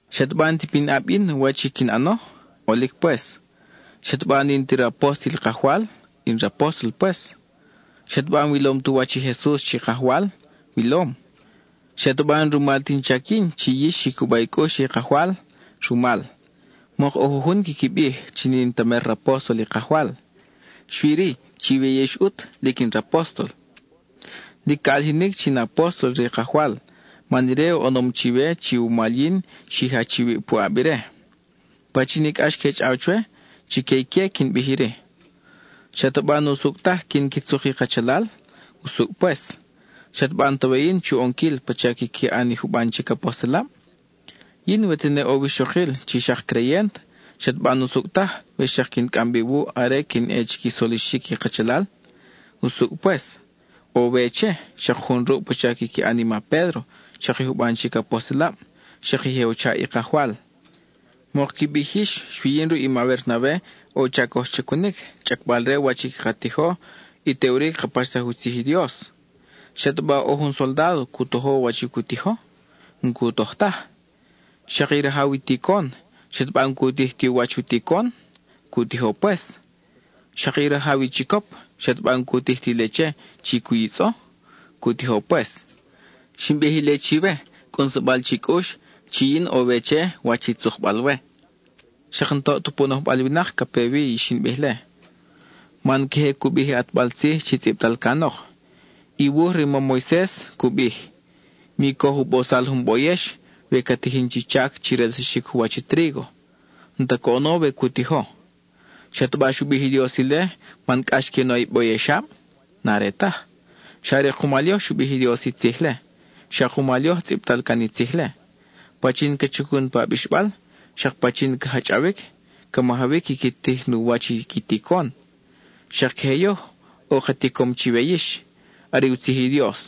¿Xataba n-ta pinʼab yin wach i quin ʼano? ʼOlic pues. ¿Xataba n-in ti rapóstol i Kajwal? In rapóstol pues. ¿Xataba n-wilom tu wach i Jesus chi Kajwal? Wilom. ¿Xataba n-rumal ti in chac yin chi yix xi cuba i cʼux che i Kajwal? Rumal. Mok ʼo jujun quiqui bij chi n-in ta mer rapóstol i Kajwal; xui-ri, chiwe yix ʼut lic in rapóstol. Lic ca ʼalijinic chi in apóstol re i Kajwal man ire oʼonom chiwe chi wumal yin xi jach iwib puʼab ire. Pachin i cʼax que chʼaw chwe, chique ique quin bij iri: ¿Xataba n-usucʼ taj quin qui tzuk i kachalal? Usucʼ pues. ¿Xataba n-ta we yin chu ʼonquil pacha quiqui ʼan i juban chic apostelab? Yin we tene ʼo wixokil chi xak creyent, ¿xataba n-usucʼ taj we xak quin cʼam bi wuʼ are quin ʼe chi qui solixic i kachalal? Usucʼ pues, ʼo we che, xak jun ruʼ pacha quiqui ʼan i ma Pédro, xak i juban chic apostelab, xak i je u chaʼ i Kajwal. Mok qui bij yix xui yin ruʼi ma Bernabe ʼo u chac coj chacunic, chʼacbal re wach i caka tijo y teʼuri caka paxsaj u tzij i Dios. ¿Xataba ʼo jun soldádo cu tojo wach i cu tijo? N-cu toj taj. Xak i rajaw i ticon, ¿xataba n-cu tij ti u wach i u ticon? Cu tijo pues. Xak i rajaw i chicop ¿xataba n-cu tij ti leche chi cu yitzʼo? Cu tijo pues. (Xin bij ile chiwe cʼunsabal chi cʼux, chi yin ʼo we che wach i tzukbal we.) Xak n-toʼ ta pu nojbal winak ca pe wi i xin bij-le, man queje cu bij i ʼatbal tzij chi tzʼibtal canok. I wuj re i mam Moises cu bij, “Mi coj u bosal jun boyex we ca tijin chi chac chi relsaxic u wach i trígo,” (n-ta coʼono we cu tijo). ¿Xataba xu bij i Dios ile man cʼax que u na i boyexab? N-are taj, xa are kumal yoj xu bij i Dios i tzij-le; xa kumal yoj tzʼibtal can i tzij-le. Pachin ca chacun pa abixbal, xak pachin ca jachʼawic, ca majawic quiqui tij nu wach i qui ticon. Xak queje yoj, ʼo ka ticom chiwe yix; are u tzij i Dios.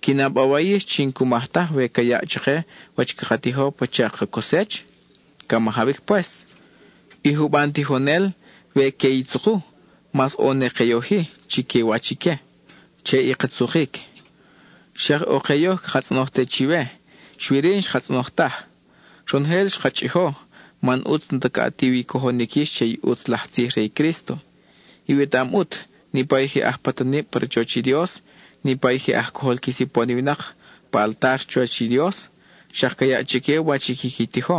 ¿Qui na bawa yix chi n-cu maj taj we ca yaʼ chake wach caka tijo pacha ka cosech? Ca majawic pues. I juban tijonel, we que i tzuku, mas ʼo ne ke yoj-i chiquiwach ique, che i ka tzukic. Xak ʼo ke yoj caka tzʼonoj te chiwe, xui-ri n-xka tzʼonoj taj. Ronojel xka chʼijo, man ʼutz n-ta ca ʼatiw i cojonic yix che i ʼutz laj tzij re i Crísto. Iwetaʼam ʼut, niʼpa i je aj patanib pa rachoch i Dios, niʼpa i je aj cojol qui sipon i winak pa altar chuwach i Dios, xak ca yaʼ chique wach i quiqui tijo;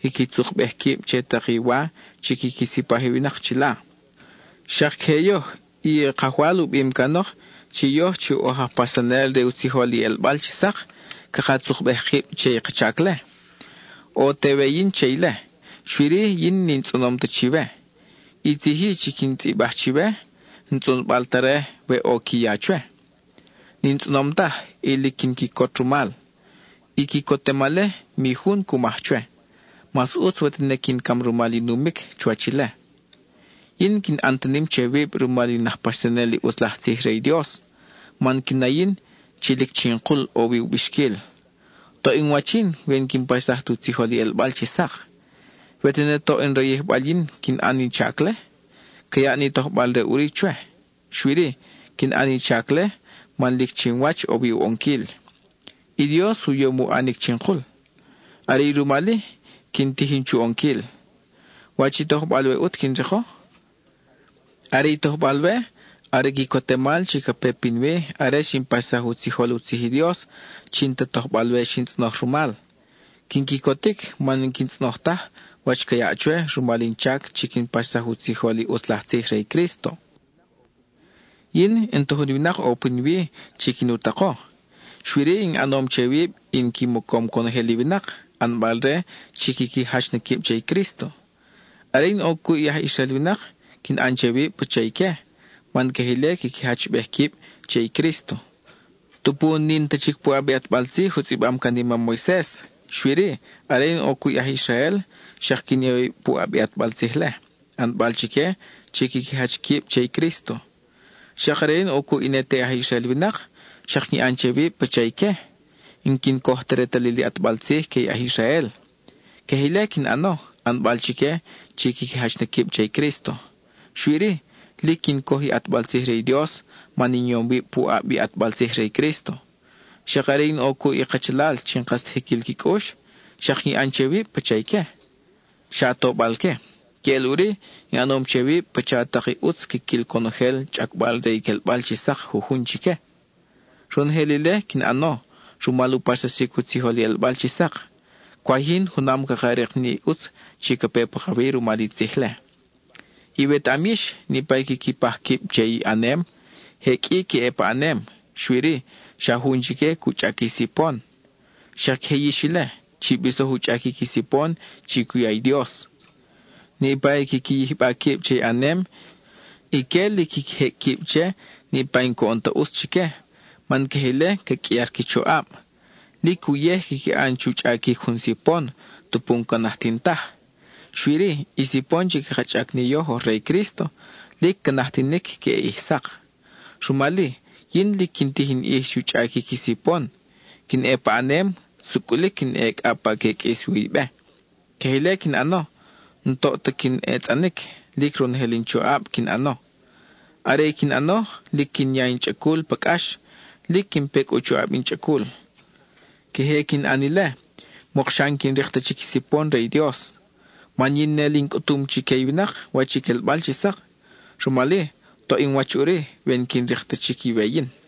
quiqui tzukbej quib che tak i wa chi quiqui sipaj i winak chila. Xak queje yoj, i Kajwal u bim canok chi yoj chi oj aj paxsanel re u tzijol i ʼelbal chi sak, caka tzukbej kib che i ka chac-le. ʼO te we yin che ile, xui-ri yin n-in tzʼonom ta chiwe. I tzij-i chi quin tzʼibaj chiwe, n-tzʼonbal ta re, we ʼo qui ya chwe. N-in tzʼonom taj, y lic quin quicot rumal. I quicotemal-le, mi jun cu maj chwe; mas ʼutz we tene quin cam rumal i numic chuwach ile. Yin n-quin ʼan ta nim che wib rumal in aj paxsanel i ʼutz laj tzij re i Dios, man quin na yin chi lic chinkul ʼo wi u bixquil. ¡Toʼ in wach yin we n-quin paxsaj tu tzijol i ʼelbal chi sak! We tene toʼ in rayijbal yin quin ʼan i chac-le, ca yaʼ ni tojbal re ʼuri chwe. Xui-ri, quin ʼan in chac-le man lic chinwach ʼo wi u ʼonquil; i Dios u yom u ʼanic chinkul. Are i rumal-i quin tijin chu ʼonquil. ¿Wach i tojbal-we ʼut quin riko? Are i tojbal-we are i quicotemal chi ca pe pinwi are xin paxsaj u tzijol u tzij i Dios chi n-ta tojbal-we xin tzʼonoj rumal. Quin quicotic man n-quin tzʼonoj taj wach ca yaʼ chwe rumal in chac chi quin paxsaj u tzijol i ʼutz laj tzij re i Crísto. Yin, n-ta jun winak ʼo pinwi chi quin u tako, xui-ri, in ʼanom che wib in qui mocom conojel i winak, ʼanbal-re chi quiqui jach na quib che i Crísto. Are in ʼo cuʼ i aj Israel winak, quin ʼan che wib pacha ique, man queje ile quiqui jachbej quib che i Crísto. Tupu n-in ta chic puʼab i ʼatbal tzij u tzʼibam can i mam Moises, xui-ri, are in ʼo cuʼ i aj Israel, xak quin ya wib puʼab i ʼatbal tzij-le, ʼanbal chique chi quiqui jach quib che i Crísto. Xak are in ʼo cuʼ i ne te aj Israel winak, xak quin ʼan che wib pacha ique, n-quin coj ta retalil i ʼatbal tzij que i aj Israel. Queje ile quin ʼano, ʼanbal chique chi quiqui jach na quib che i Crísto. Xui-ri, lic quin coj i ʼatbal tzij re i Dios man in yom wib puʼab i ʼatbal tzij re i Crísto. Xak are in ʼo cuʼ i kachalal chi n-kas ta jiquil qui cʼux, xak quin ʼan che wib pacha ique, xa tobal-que. Queʼel ʼuri, in ʼanom che wib pacha tak i ʼutz quiquil conojel, chʼacbal re i quelbal chi sak jujun chique. Ronojel ile quin ʼano rumal u paxsaxic u tzijol i ʼelbal chi sak; cwaj yin junam caka rik ni ʼutz chi ca pe pakawi rumal i tzij-le. Iwetaʼam yix, niʼpa i quiqui paj quib che i ʼanem, je qʼui que ʼe pa ʼanem, xui-ri, xa jun chique cu chʼac i sipon. Xak queje yix ile, chi bisoj u chʼaquic i sipon chi cu ya i Dios. Niʼpa i quiqui yijba quib che i ʼanem, ique lic quiqui jecʼ quib che niʼpa i n-coʼon ta ʼutz chique, man queje ile ca qʼuiar qui choʼab. Lic uyej quiqui ʼan chu chʼaquic jun sipon tupu n-ca najtin taj. Xui-ri, i sipon chi caka chʼac ni yoj oj re i Crísto, lic ca najtinic queʼe ʼij sak. Rumal-i, yin lic quin tij in ʼij chu chʼaquic i sipon; quin ʼe paʼanem; sucʼulic quin ʼe cʼa pa ca ʼe qʼuis wi i be. Queje ile quin ʼano, n-toʼ ta quin etzʼanic; lic ronojel in choʼab quin ʼano. Are i quin ʼano, lic quin ya in chʼacul pa cʼax, lic quin pecʼ u choʼab in chʼacul. Queje quin ʼan ile, mokxa n-quin rik ta chic i sipon re i Dios. Man yin ne li in cʼutum chique i winak wach i quelbal chi sak, rumal-i, toʼ in wach ʼuri we n-quin rik ta chic i we yin.